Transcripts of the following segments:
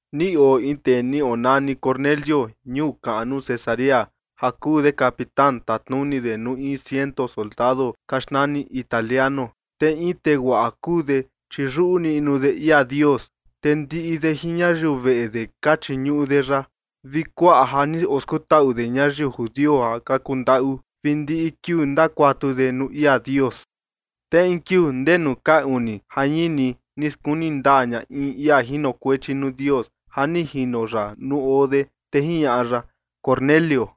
Ni oo in tee ni onani Cornelio ñuu kaꞌnu Cesarea ja kuu de capitán, tatnuni de nuu in ciento soldado ka xnani “Italiano”. Te in tee guaꞌa kuu de, chi yuꞌu niꞌnu de ia Dios, te ndiꞌi de jin ñayiu veꞌe de ka chiñuꞌu de ya, vi kuaꞌa ja ni oskutaꞌu de ñayiu judio ja ka kuu ndaꞌu, vi ndi kiuu ndakuatu de nuu ia Dios. Te in kiuu ndee nuu ka uni jañini ni skuni ndaa ña in ia jinokuechi nuu Dios ja ni jino ya nuu oo de, te jiñaꞌa ya: ―Cornelio.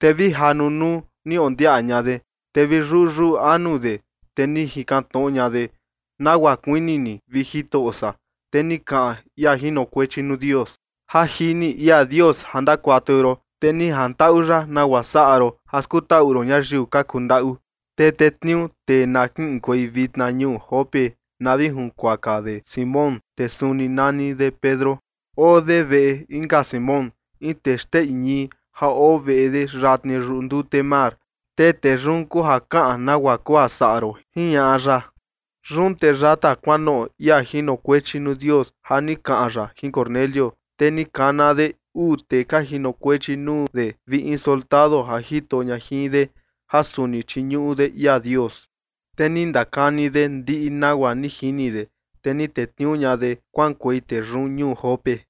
Te vi ja nunuu ni ondiaꞌa ña de, te vi yuyuꞌu anu de, te ni jikan tnoꞌo ña de: ―¿Nagua kuini ni, vi Jitoꞌo san? Te ni kaꞌan ia jinokuechi nuu Dios: ―Ja jini ia Dios ja ndakuatu ron, te ni jantaꞌu ya nagua saꞌa ron ja skutaꞌu ron ñayiu ka kundaꞌu. Te tetniuu tee na kiꞌinkuei vitna ñuu Jope na vi junkuaka de Simón, tee suni nani de Pedro. Oo de veꞌe inka Simón, in tee xteꞌi ñii ja oo veꞌe de yatni yuꞌu ndute mar. Te tee yun kuu ja kaꞌan nagua kuu ja saꞌa ron ―jiñaꞌa ya. Yun te yata kuanoꞌo ia jinokuechi nuu Dios ja ni kaꞌan ya jin Cornelio, te ni kana de uu tee ka jinokuechi nuu de vi in soldado ja jito ña jin de ja suni chiñuꞌu de ia Dios. Te ni ndakani de ndiꞌi nagua ni jini de, te ni tetniuu ña de kuaꞌankuei tee yun ñuu Jope.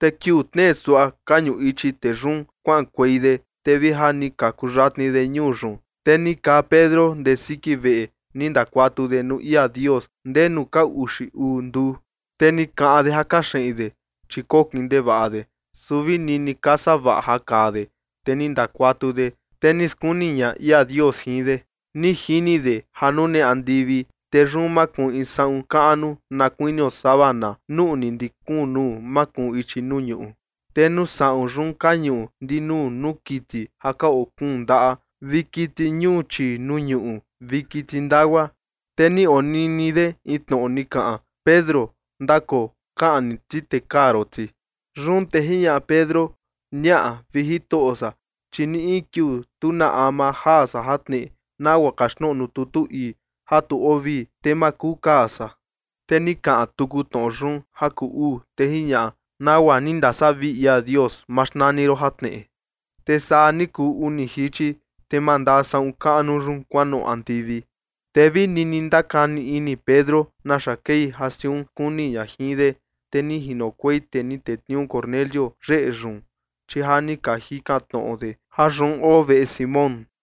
Te kiuu tnee suaꞌa ka ñuꞌu ichi tee yun kuaꞌankuei de, te vi ja ni ka kuyatni de ñuu yun, te ni kaa Pedro ndee siki veꞌe ni ndakuatu de nuu ia Dios ndee nuu ka uxi uu nduu. Te ni kaꞌan de ja kaxeꞌin de, chi kokin ndevaꞌa de, su vi nini ka savaꞌa ja kaa de, te ni ndakuatu de, te ni skuni ña ia Dios jin de. Ni jini de ja nune andivi, te yun makuun na kuinio in saꞌun kuijin kaꞌnu nuꞌni ndii kuun nuu makuun ichi nuu ñuꞌu. Te nuu saꞌun yun ka ñuꞌu ndinuu nuu kiti ja ka oo kuun ndaꞌa vi kiti ñuu chii nuu ñuꞌu vi kiti ndagua. Te ni onini de in tnoꞌo ni kaꞌan: ―Pedro, ndakoo, kaꞌni ti te kaa ron ti. Yun te jiñaꞌa Pedro: ―Ñaꞌa, vi Jitoꞌo san, chi ni in kiuu tu na ama jaa san jatneꞌe, nagua kaxtnoꞌo nuu tutu ii ja tu oo vii, te ma kuu kaa san. Te ni kaꞌan tuku tnoꞌo yun ja kuu uu, te jiñaꞌa: ―Nagua ni ndasavii ia Dios ma xnani ron jatneꞌe. Te saa ni kuu uni jichi, te mandaa saꞌun kaꞌnu yun kuanoꞌo andivi. Te vi nini ndakani ini Pedro naxa kei ja siun ni skuni ña jin de, te ni jinokuei tee ni tetniuu Cornelio yeꞌe yun, chi ja ni ka jikan tnoꞌo de ja yun oo veꞌe Simón.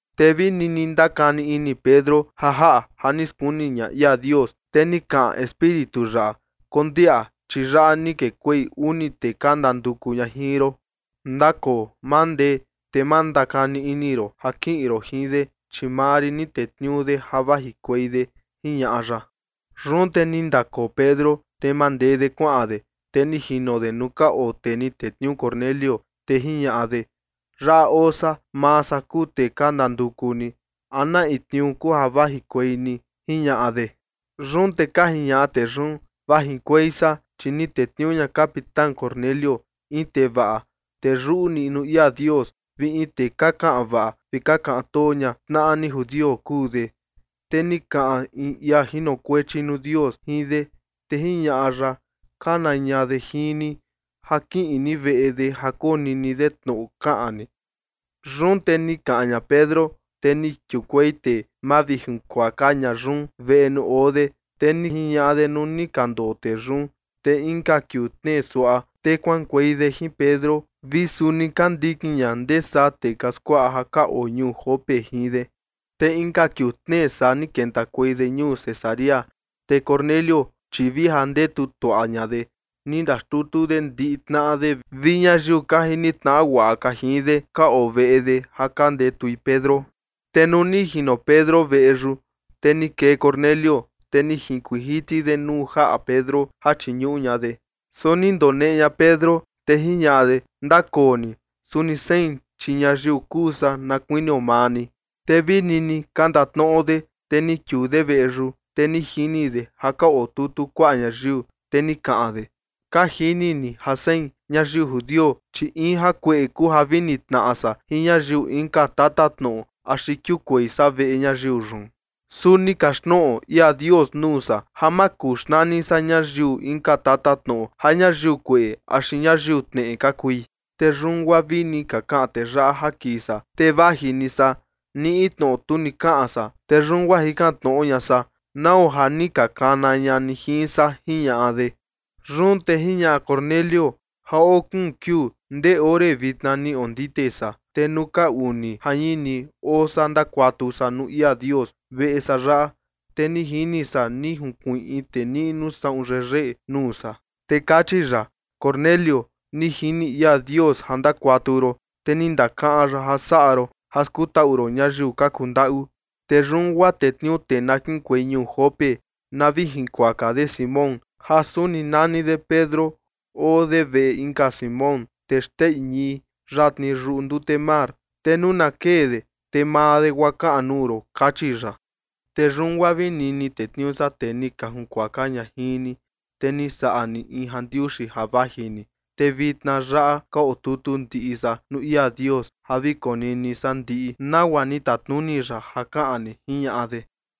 Te vi nini ndakani ini Pedro ja jaꞌa ja ni skuni ña ia Dios, te ni kaꞌan Espíritu ya: ―Kondiaꞌa, chi yaꞌa ni kekuei uni tee ka ndanduku ña jin ron. Ndakoo, mandee, te ma ndakani ini ron ja kiꞌin ron jin de, chi maa rin ni tetniuu de ja vajikuei de ―jiñaꞌa ya. Yun te ni ndakoo Pedro, te mandee de kuaꞌan de, te ni jino de nuu ka oo tee ni tetniuu Cornelio, te jiñaꞌa de: ―Yaꞌa oo san. Maa san kuu tee ka ndanduku ni. ¿A na in tniuu kuu ja vajikuei ni? ―jiñaꞌa de. Yun te ka jiñaꞌa tee yun: ―Vajikuei san, chi ni tetniuu ña capitán Cornelio, in tee vaꞌa, tee yuꞌu niꞌnu ia Dios vi in tee ka kaꞌan vaꞌa vi ka kaꞌan too ña tnaꞌa ni judio kuu de. Te ni kaꞌan in ia jinokuechi nuu Dios jin de, te jiñaꞌa ya ja kana ña de jin ni ja kiꞌin ni veꞌe de ja konini de tnoꞌo kaꞌan ni. Yun te ni kaꞌan ña Pedro, te ni kiukuei tee mavijinkuaka ña yun veꞌe nuu oo de. Te ni jiñaꞌa de nuu ni ka ndoo tee yun. Te inka kiuu tnee suaꞌa, te kuaꞌankuei de jin Pedro vi suni ka ndikin ña ndee saa tee ka skuaꞌa ja ka oo ñuu Jope jin de. Te inka kiuu tnee saa ni kentakuei de ñuu Cesarea. Te Cornelio, chi vi ja ndetu tuaꞌa ña de, ni ndaxtutu de ndiꞌi tnaꞌa de vi ñayiu ka jini tnaꞌa guaꞌa ka jin de, ka oo veꞌe de ja ka ndetui Pedro. Te nuu ni jino Pedro veꞌe yun, te ni kee Cornelio, te ni junkuiin jiti de nuu jaꞌa Pedro ja chiñuꞌu ña de. Su ni ndoneꞌe ña Pedro, te jiñaꞌa de: ―Ndakoo ni. Suni sein, chi ñayiu kuu san na kuinio maa ni. Te vi nini ka ndatnoꞌo de, te ni kiuu de veꞌe yun, te ni jini de ja ka otutu kuaꞌa ñayiu. Te ni kaꞌan de: ―Ka jini ni ja sein, ñayiu judio, chi in jakueꞌe kuu ja vi nitnaꞌa san jin ñayiu inka tatatnoꞌo axi kiukuei san veꞌe ñayiu yun. Su ni kaxtnoꞌo ia Dios nuu san ja ma kuu xnani san ñayiu inka tatatnoꞌo ja ñayiu kueꞌe axi ñayiu tneꞌe ka kui. Te yun guaa vini ka kaꞌan tee yaꞌa ja kii san, te vaji ni san, ni in tnoꞌo tu ni kaꞌan san. Te yun guaa jikan tnoꞌo ña san, ¿nau ja ni ka kana ña ni jin san? ―jiñaꞌa de. Yun te jiñaꞌa Cornelio: ―Ja oo kuun kiuu ndee ore vitna ni ondite san. Te nuu ka uni jañini oo san ndakuatu san nuu ia Dios veꞌe san yaꞌa, te ni jini san ni junkuiin in tee niꞌnu saꞌun yeyeꞌe nuu san. Te kachi ya: “Cornelio, ni jini ia Dios ja ndakuatu ron, te ni ndakaꞌan ya ja saꞌa ron ja skutaꞌu ron ñayiu ka kundaꞌu. Te yun guaa tetniuu tee na kiꞌinkuei ñuu Jope na vi jinkuaka de Simón ja suni nani de Pedro, oo de veꞌe inka Simón, tee xteꞌi ñii, yatni yuꞌu ndute mar. Te nuu na kee de, te maa de guaa kaꞌan nuu ron” kachi ya. Te yun guaa vini ni tetniuu san tee ni ka jakuaka ña jin ni, te ni saꞌa ni in jandiuxi ja vaji ni. Te vitna yaꞌa ka otutu ndiꞌi san nuu ia Dios ja vi konini san ndiꞌi nagua ni tatnuni ya ja kaꞌan ni ―jiñaꞌa de.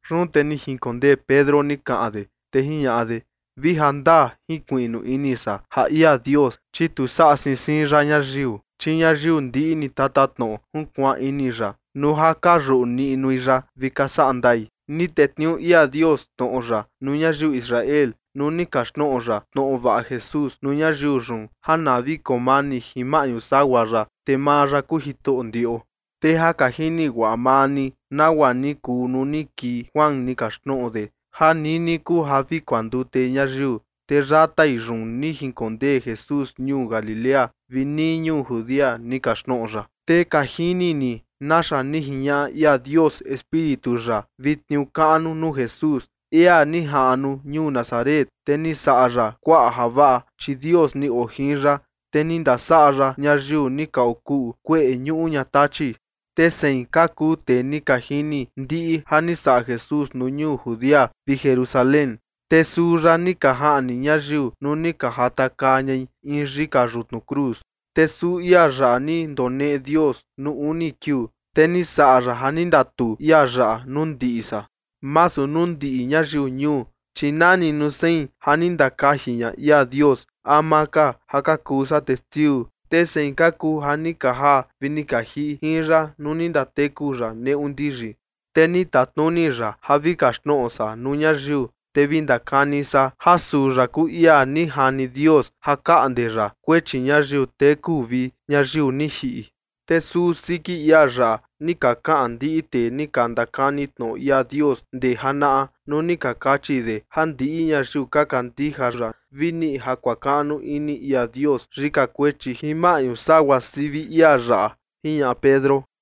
Yun te ni jinkondee Pedro ni kaꞌan de, te jiñaꞌa de: ―Vi jandaa jinkuiꞌnu ini san ja ia Dios, chi tu saꞌa siin siin ya ñayiu. Chi ñayiu ndiꞌi ni tatatnoꞌo junkuaan ini ya nuu ja ka yuꞌu niꞌnui ya vi ka saꞌa ndai. Ni tetniuu ia Dios tnoꞌo ya nuu ñayiu Israel nuu ni kaxtnoꞌo ya tnoꞌo vaꞌa Jesús nuu ñayiu yun ja na vi koo mani jin maꞌñu sagua ya, te maa ya kuu Jitoꞌo ndiꞌo. Te ja ka jini guaꞌa maa ni nagua ni kuu nuu ni kii Juan ni kaxtnoꞌo de ja nini kuu ja vi kuandute ñayiu. Te yatai yun ni jinkondee Jesús ñuu Galilea vi nii ñuu Judea ni kaxtnoꞌo ya. Te ka jini ni naxa ni jiñaꞌa ia Dios Espíritu ya vi tniuu kaꞌnu nuu Jesús, ia ni jaꞌnu ñuu Nazaret, te ni saꞌa ya kuaꞌa javaꞌa, chi Dios ni oo jin ya. Te ni ndasaꞌa ya ñayiu ni ka okuꞌu kueꞌe ñuꞌu ña tachi. Te sein ka kuu tee ni ka jini ndiꞌi ja ni saꞌa Jesús nuu ñuu Judea vi Jerusalén. Te suu ya ni ka jaꞌni ñayiu nuu ni ka jatakaa ñai in yika yutnu cruz. Te suu ia yaꞌa ni ndoneꞌe Dios nuu uni kiuu, te ni saꞌa ya ja ni ndatuu ia yaꞌa nuu ndiꞌi san, masu nuu ndiꞌi ñayiu ñuu, chi nani nuu sein ja ni ndakaji ña ia Dios ama ka ja ka kuu san testiu. Te sein ka kuu ja ni ka jaa vi ni ka jiꞌi jin ya nuu ni ndateku ya neꞌu ndiyi. Te ni tatnuni ya ja vi kaxtnoꞌo san nuu ñayiu, te vi ndakani san ja suu ya kuu ia ni jani Dios ja kaꞌnde ya kuechi ñayiu teku vi ñayiu ni jiꞌi. Te suu siki ia yaꞌa ni ka kaꞌan ndiꞌi tee ni ka ndakani tnoꞌo ia Dios ndee janaꞌa nuu ni ka kachi de ja ndiꞌi ñayiu ka kandija ya vi niꞌi ja kuakaꞌnu ini ia Dios yika kuechi jin maꞌñu sagua sivi ia yaꞌa ―jiñaꞌa Pedro.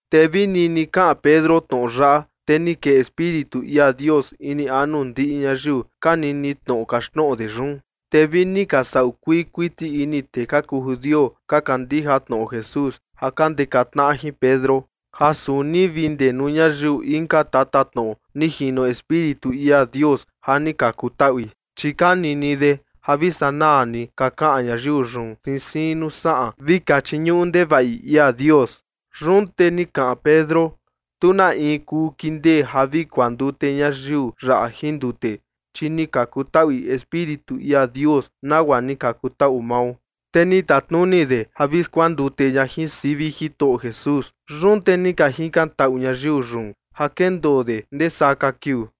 Te vi nini kaꞌan Pedro tnoꞌo yaꞌa, te ni kee Espíritu ia Dios ini anu ndiꞌi ñayiu ka nini tnoꞌo kaxtnoꞌo de yun. Te vi ni ka saꞌu kuii kuiti ini tee ka kuu judio ka kandija tnoꞌo Jesús ja ka ndeka tnaꞌa jin Pedro, ja suni vi ndee nuu ñayiu inka tatatnoꞌo ni jino Espíritu ia Dios ja ni ka kutaꞌui. Chi ka nini de ja vi sanaa ni ka kaꞌan ñayiu yun siin siin nuu saꞌan vi ka chiñuꞌu ndevaꞌi ia Dios. Yun te ni kaꞌan Pedro: ―Tu na in kuu kindee ja vi kuandute ñayiu yaꞌa jin ndute, chi ni ka kutaꞌui Espíritu ia Dios, nagua ni ka kutaꞌu mao. Te ni tatnuni de ja vi skuandute ña jin sivi Jitoꞌo Jesús. Yun te ni ka jikan taꞌu ñayiu yun ja kendoo de ndee saa ka kiuu.